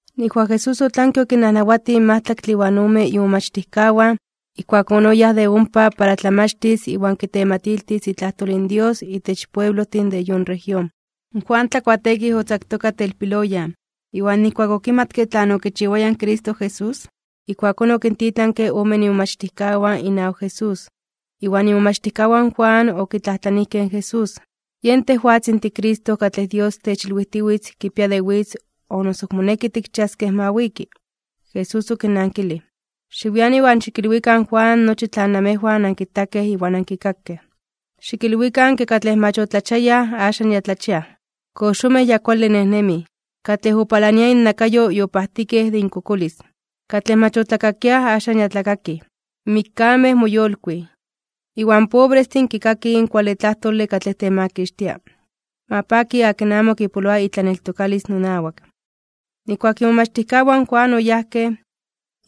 Nijkuak Jesús otlanke okinnajnawatij in majtlaktle iwan ome imomachtijkawan, ijkuakón oyáj de ompa para tlamachtis iwan kitematiltis itlajtol in Dios itech pueblojtin de yon región. In Juan Tlakuateekij otzaktoka telpiloyan, iwan nijkuak okimatke tlan okichiwaya in Cristo Jesús, ijkuakón okintitlanke omen imomachtijkawan inawak Jesús. Iwan imomachtijkawan in Juan okitlajtlanijkej in Jesús: ―¿Yen tejwatzin tiCristo katlej Dios techilwijtiwitz kipia de witz o noso ok moneki tikchiaskej ma wiki? Jesús okinnankilij: ―Xiwian iwan xikilwikan in Juan nochi tlan namejwan ankitakej iwan ankikakej. Xikilwikan ke katlej mach otlachiayaj axan ya tlachiaj, in koxomej ya kuale nejnemij, katlej opalania innakayo yopajtikej de inkokolis, katlej mach otlakakiaj axan ya tlakakij, in mikkamej moyolkuij, iwan pobrestin kikakij in kuale tlajtole katlej temakixtia. Ma paki akin amo kipoloa itlaneltokalis nonawak. Nijkuak imomachtijkawan in Juan oyajkej,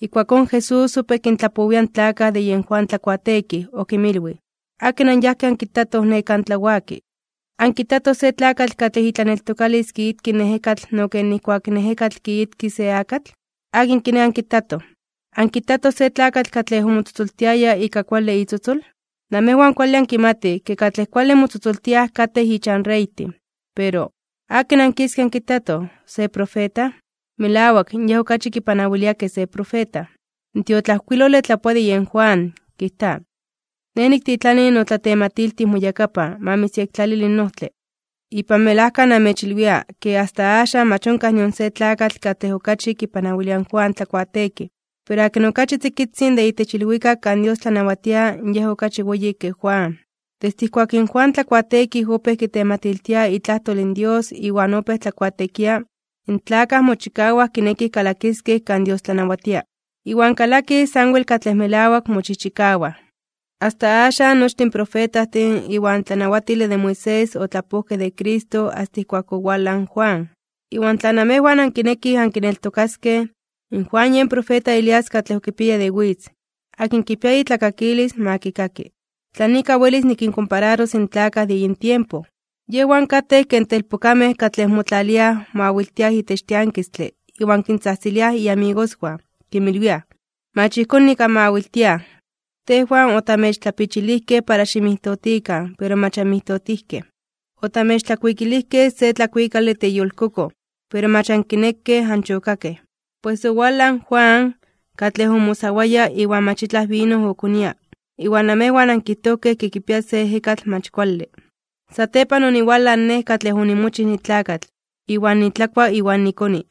ijkuakón Jesús opéj kintlapowia in tlakaj de yen Juan Tlakuateekij. Okinmilwij: ―¿Akin anyajkej ankitatoj ne kan tlawaki? ¿Ankitatoj se tlakatl katlej itlaneltokalis kiitki in ejekatl no ken nijkuak in ejekatl kiitki se akatl? ¿Akin kiné ankitatoj? ¿Ankitatoj se tlakatl katlej omotzotzoltiaya ika kuale itzotzol? Namejwan kuale ankimatij ke katlej kuale motzotzoltiaj katej ichan reytin. Pero, ¿akin ankiskej ankitatoj? ¿Se profeta? Melawak, yej okachi kipanawilia ke se profeta. In tiotlajkuilole tlapoa de yen Juan, kijta: Nej niktitlani notlatematiltij moyakapan, ma mitzyektlalili in ojtle. Ipan melajka namechilwia, ke asta axan mach onkaj nion se tlakatl katlej okachi kipanawilia in Juan Tlakuateekij. Pero akin okachi tzikitzin de itech ilwikak kan Dios tlanawatia yen okachi weyi ke Juan. ’Desde ijkuak in Juan Tlakuateekij opéj kitematiltia itlajtol in Dios iwan opéj tlakuateekia, in tlakaj mochikawaj kinekij kalakiskej kan Dios tlanawatia. Iwan kalakij sanwel katlej melawak mochijchikawaj. Asta axan nochtin in profetajtin iwan tlanawatile de Moisés otlapojkej de Cristo asta ijkuak owalaj in Juan. Iwan tla namejwan ankinekij ankineltokaskej, Juan yen profeta Elías katlej okipiaya de witz. Akin kipia itlakakilis, ma kikaki. ’¿Tlan ika welis nikinkompararos in tlakaj de yin tiempo? Yejwan katej ken telpokamej katlej motlaliaj mawiltiaj itech tiankistle iwan kintzajtziliaj inmamigoswan, kinmilwiaj: “Mach ijkón nik anmawiltiaj. Tejwan otamechtlapichilijkej para ximijtotikan, pero mach anmijtotijkej. Otamechtlakuikilijkej se tlakuikale teyolkokoj, pero mach ankinekej anchokakej.” Pues, owalaj in Juan, katlej omosawaya (oayunaroaya) iwan mach itlaj vino okonia. Iwan namejwan ankijtojkej ke kipia se ejekatl mach kuale. Satepan oniwalaj Nej katlej onimochij nitlakatl, iwan nitlakua iwan nikoni.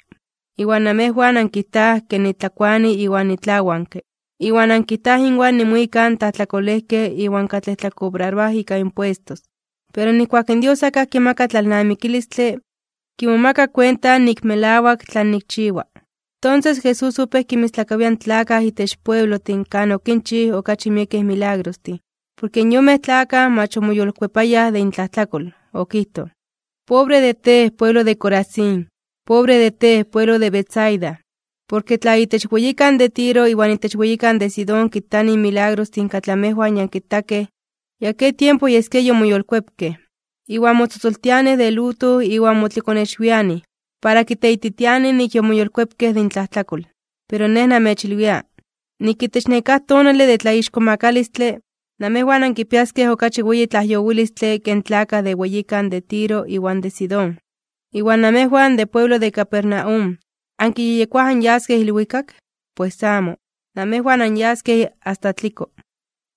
Iwan namejwan ankijtaj ke nitlakuani iwan nitlawanke, iwan ankijtaj inwan nimuika in tlajtlakolejkej iwan katlej tlakobraroaj ika impuestos. Pero nijkuak in Dios akaj kimaka tlalnamikilistle, kimomaka kuenta nik melawak tlan nikchiwa. Tonses Jesús opéj kinmistlakawia in tlakaj itech pueblojtin kan okinchij okachi miekej milagrostin, porke in yonmej tlakaj mach omoyolkuepayaj de intlajtlakol. Okijtoj: ―¡Pobre de tej, pueblo de Corazín! ¡Pobre de tej, pueblo de Betsaida! Porke tla itech weyikan de Tiro iwan itech weyikan de Sidón kitanij in milagrostin katlej amejwan ya ankitakej, ya ke tiempo yeskia yomoyolkuepkej. Iwan motzotzoltianij de luto iwan motlikonexwianij, para kiteititianij nik yomoyolkuepkej de intlajtlakol. Pero Nej namechilwia, nik itech nekáj tonale de tlaixkomakalistle (tlatzonmanalos), namejwan ankipiaskej okachi weyi tlajyowilistle ke in tlakaj de weyikan de Tiro iwan de Sidón. Iwan namejwan de pueblo de Capernaum, ¿ankiyejyekoaj anyaskej ilwikak? ¡Pues amo! Namejwan anyaskej asta tliko.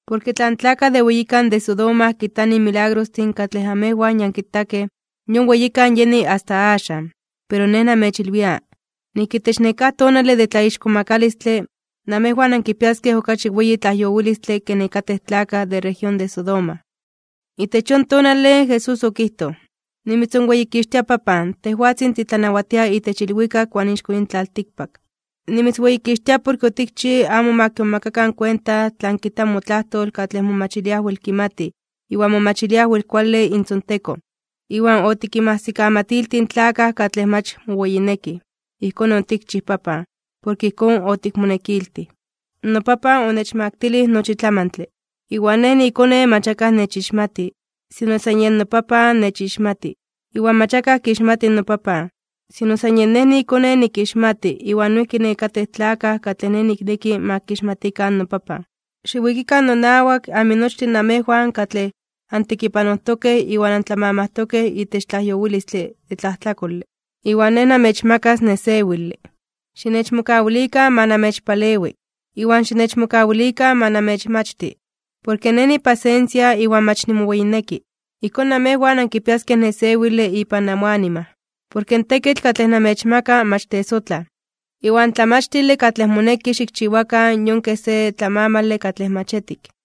Porke tla in tlakaj de weyikan de Sodoma kitanij in milagrostin katlej amejwan ya ankitakej, yon weyikan yeni asta axan. Pero Nej namechilwia, nik itech nekáj tonale de tlaixkomakalistle (tlatzonmanalos), namejwan ankipiaskej okachi weyi tlajyowilistle ke nekatej tlakaj de región de Sodoma. Itech yon tonale, Jesús okijtoj: ―Nimitzonweyikixtia Papan, tejwatzin titlanawatia itech ilwikak iwan ixko yin tlaltikpak. Nimitzweyikixtia porke otikchij amo ma kimomakakan kuenta tlan kijta motlajtol katlej momachiliaj wel kimatij iwan momachiliaj wel kuale intzontekon, iwan otikinmajsikamatiltij in tlakaj katlej mach moweyinekij. Ijkón otikchij, Papan, porke ijkón otikmonekiltij. ’NoPapan onechmaktilij nochi tlamantle. Iwan Nej niiKone mach akaj nechixmati, sino san yej noPapan nechixmati. Iwan mach akaj kixmati noPapan, sino san yen Nej niiKone nikixmati iwan noijki nekatej tlakaj katlej Nej nikneki ma kixmatikan noPapan. Xiwikikan nonawak, aminochtin namejwan katlej antekipanojtokej iwan antlamamajtokej itech tlajyowilistle de tlajtlakole, iwan Nej namechmakas nesewile. Xinechmokawilikan ma namechpalewi, iwan xinechmokawilikan ma namechmachti, porke Nej nipasensia iwan mach nimoweyinekke. Ijkón namejwan ankipiaskej nesewile ipan amoanima. Porke in tekitl katlej namechmaka mach tesotlaj. Iwan in tlamachtile katlej moneki xikchiwakan yon kej se tlamamale katlej mach etik.